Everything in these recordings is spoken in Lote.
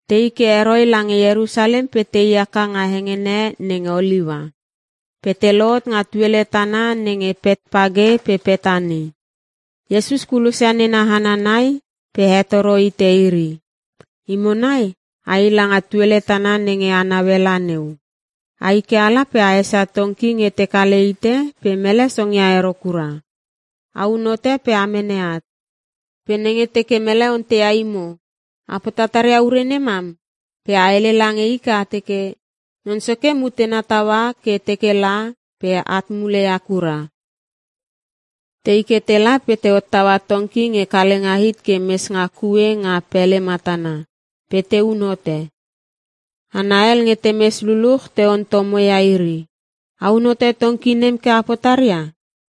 Tei ke heroi lange Ierusalem pe tei haka nga hengene nenge Oliua. Pe te lohot nga tuele tana nenge Petpage pe Petani. Iesus kulosia nena hana nai pe hetoro hite iri, “Imo nai ai langa tuele tana nenge a naue la neu. Ai ke ala pe a esia tongki nge te kale hite pe mele songia ero kura. Aun hote pe a mene at. Pe nenge teke mele onteia imo, ‘A potatar ia ure nemam?’ Pe a hele lange i ke a teke, ‘Non Soke mutena taua ke teke la, pe at muleia kura.’” Tei ke tela pe te hottaua tongki nge kalenga hit ke mes nga kue nga pele matana pe te un hote. Hana hel nge temes luluch te ontomoia iri, “A un hote tongki nem ke a potaria?”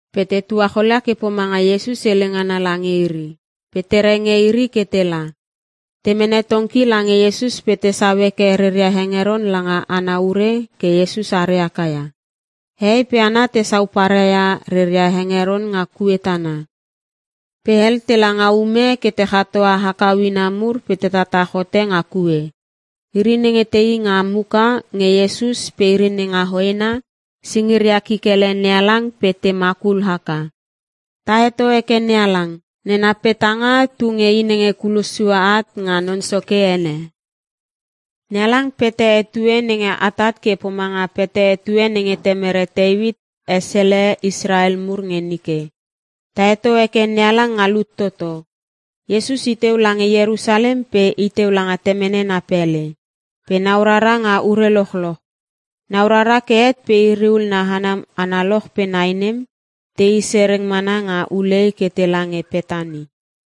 Pe te tuacholia ke pomanga Iesus hele ngana lange iri pe te renge iri ke tela. Te mene tongki lange Iesus pe tesau heke reria hengeron langa ana ure ke Iesus are haka ia. Hehei pe hana tesau parai ia reria hengeron nga kue tana. Pe hel tela nga ume ke te chatoa hakau ina mur pe te tatach hote nga kue. Iri nenge tei nga muka nge Iesus pe iri nenga hoena, singiria kikele NeHalang pe te makul haka, “Ta heto heke NeHalang! Nena petanga tu nge i nenge kulos sue at nga Non Soke ene! NeHalang pete etue nenge atat ke pomanga pete etue nenge temere Teuit esele Israel mur nge nike. Ta heto heke NeHalang nga lut toto!” Iesus iteu lange Ierusalem, pe iteu langa temene na pele. Pe nau rara nga ure lochloch. Nau rara ke het pe iri ul na hana analoch pe nai nem, tei sereng mana nga ulei ke tela nge Petani.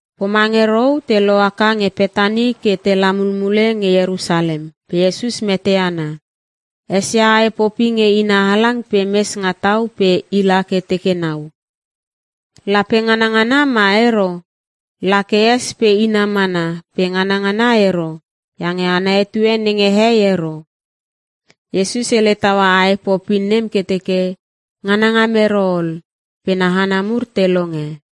Pomange rou, te lohaka nge Petani ke tela mulmule nge Ierusalem pe Iesus mete ana. Esia ae popi nge ina halang pe mes nga tau pe ila ke teke nau. Lape nganangana ma ero? La ke es pe ina mana pe nganangana ero iange ana etue nenge hei ero. Iesus hele taua ae popi nem ke teke, “Nganangam ero ol!” Pe na hana mur te longe.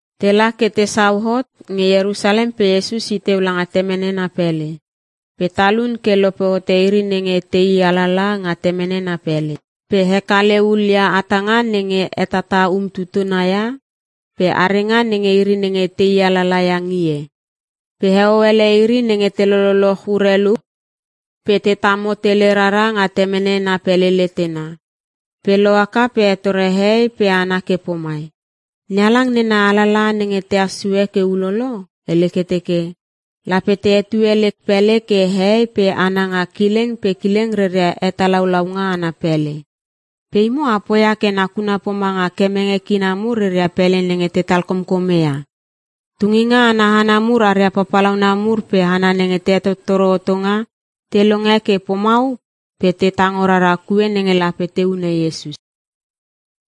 Tela ke tesau hot nge Ierusalem pe Iesus i teu langa temene na pele. Pe talun ke lope hote iri nenge tei alala nga temene na pele. Pe hekale hulia hatanga nenge te hetata umtutuna ia pe arenga nenge iri nenge tei alala ia ngie. Pe heo ele iri nenge te loloch urelu pe te tamo tele rara nga temene na pele letena. Pe lohaka pe hetore hehei pe hana ke pomai, “NeHalang nena alalaha nenge tehas sue ke ulolo, hele ke teke, “‘Lape te hetue lek pele ke hehei pe hana nga kileng pe kileng reria hetalaulaunga ana pele.’ Pe imo a poia ke nakuna pomanga kemenge kina mur reria pele nenge te talkomkome ia.” Tunginga ana hana mur aria papalauna mur pe hana nenge te hetottoro hotonga te longe ke pomau pe te tango rara kue nenge lape te hune Iesus.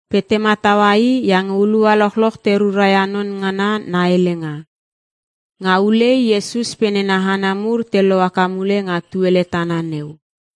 Pe te mataua i iange hulua lochloch te rura ia non ngana na helenga. Nga ulei Iesus pe nena hana mur te lohaka mule nga tuele tana neu.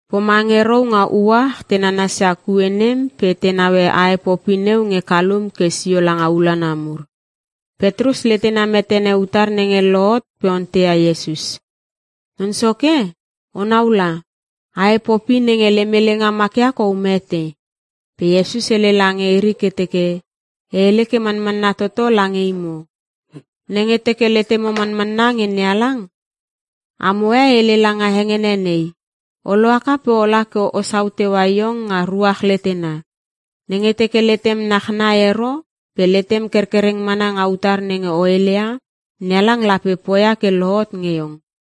Pomange rou nga uach te nanasia kue nem pe te naue ae popi neu nge kalum ke sio langa ulanlana mur. Petrus letena metene utar nenge lohot pe onteia Iesus, “Non Soke, onau la! Ae popi nenge lem helenga makia kou mete!” Pe Iesus hele lange iri ke teke, “E hele ke manmana toto lange imo. Nenge teke letemo manmanna nge NeHalang, amo e hele langa hengene nei, ‘O lohaka pe ola ke osau teua iong nga ruach letena!’ Nenge teke letem nachnai ero pe letem kerkereng mana nga utar nenge o heleia, NeHalang lape poia ke lohot nge iong.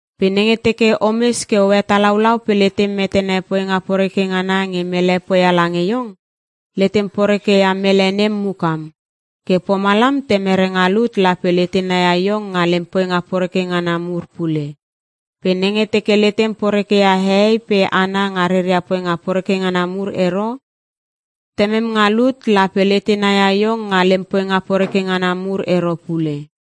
Pe nenge teke omes ke o hetalaulau pe letem metene poinga poreke ngana nge mele poia lange iong, letem poreke ia mele nem mukam. Ke pomalam temere nga lut lape letena ia iong nga lem poinga poreke ngana mur pule. Pe nenge teke letem poreke ia hehei pe hana nga reria poinga poreke ngana mur ero, temem nga lut lape letena ia iong nga lem poinga poreke ngana mur ero pule.”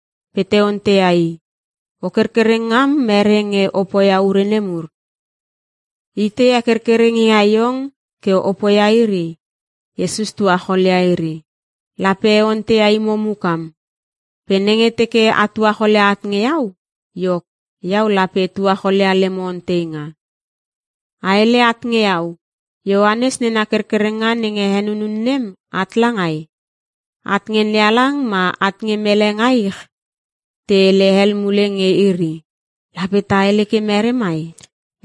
Pe te onteia i, “O kerkereng ngam mere nge o poia ure nemur? Itei he kerkereng ia iong ke o poia iri?” Iesus tuacholia iri, “Lape e onteia imo mukam. Pe nenge teke a tuacholia at nge iau, iok iau lape e tuacholia lemo onteinga. A hele at nge iau, Ioanes nena kerkerenga nenge henunun nem at langai? At nge NeHalang ma at nge mele nga ich?” Te hele hel mule nge iri, “Lape ta hele ke mere mai?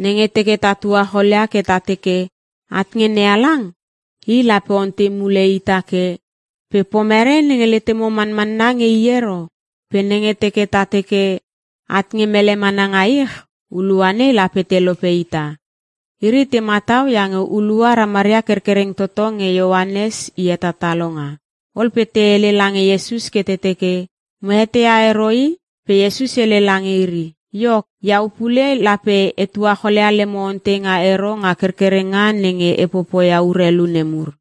Nenge teke ta tuacholia ke ta teke, ‘At nge NeHalang.’ I lape ontei mule ita ke, ‘Pe pomere nenge letemo manmanna nge i ero?’ Pe nenge teke ta teke, ‘At nge mele mana nga ich’ hulua nei lape te lope ita.” (Iri te matau iange hulua ramaria kerkereng toto nge Ioanes i hetatalonga.) Ol pe te hele lange Iesus ke te teke, “Mo eteia ero i.” Pe Iesus hele lange iri, “Iok, iau pule lape e tuacholia lemo onteinga ero nga kerkerenga nenge e popoia urelu nemur.”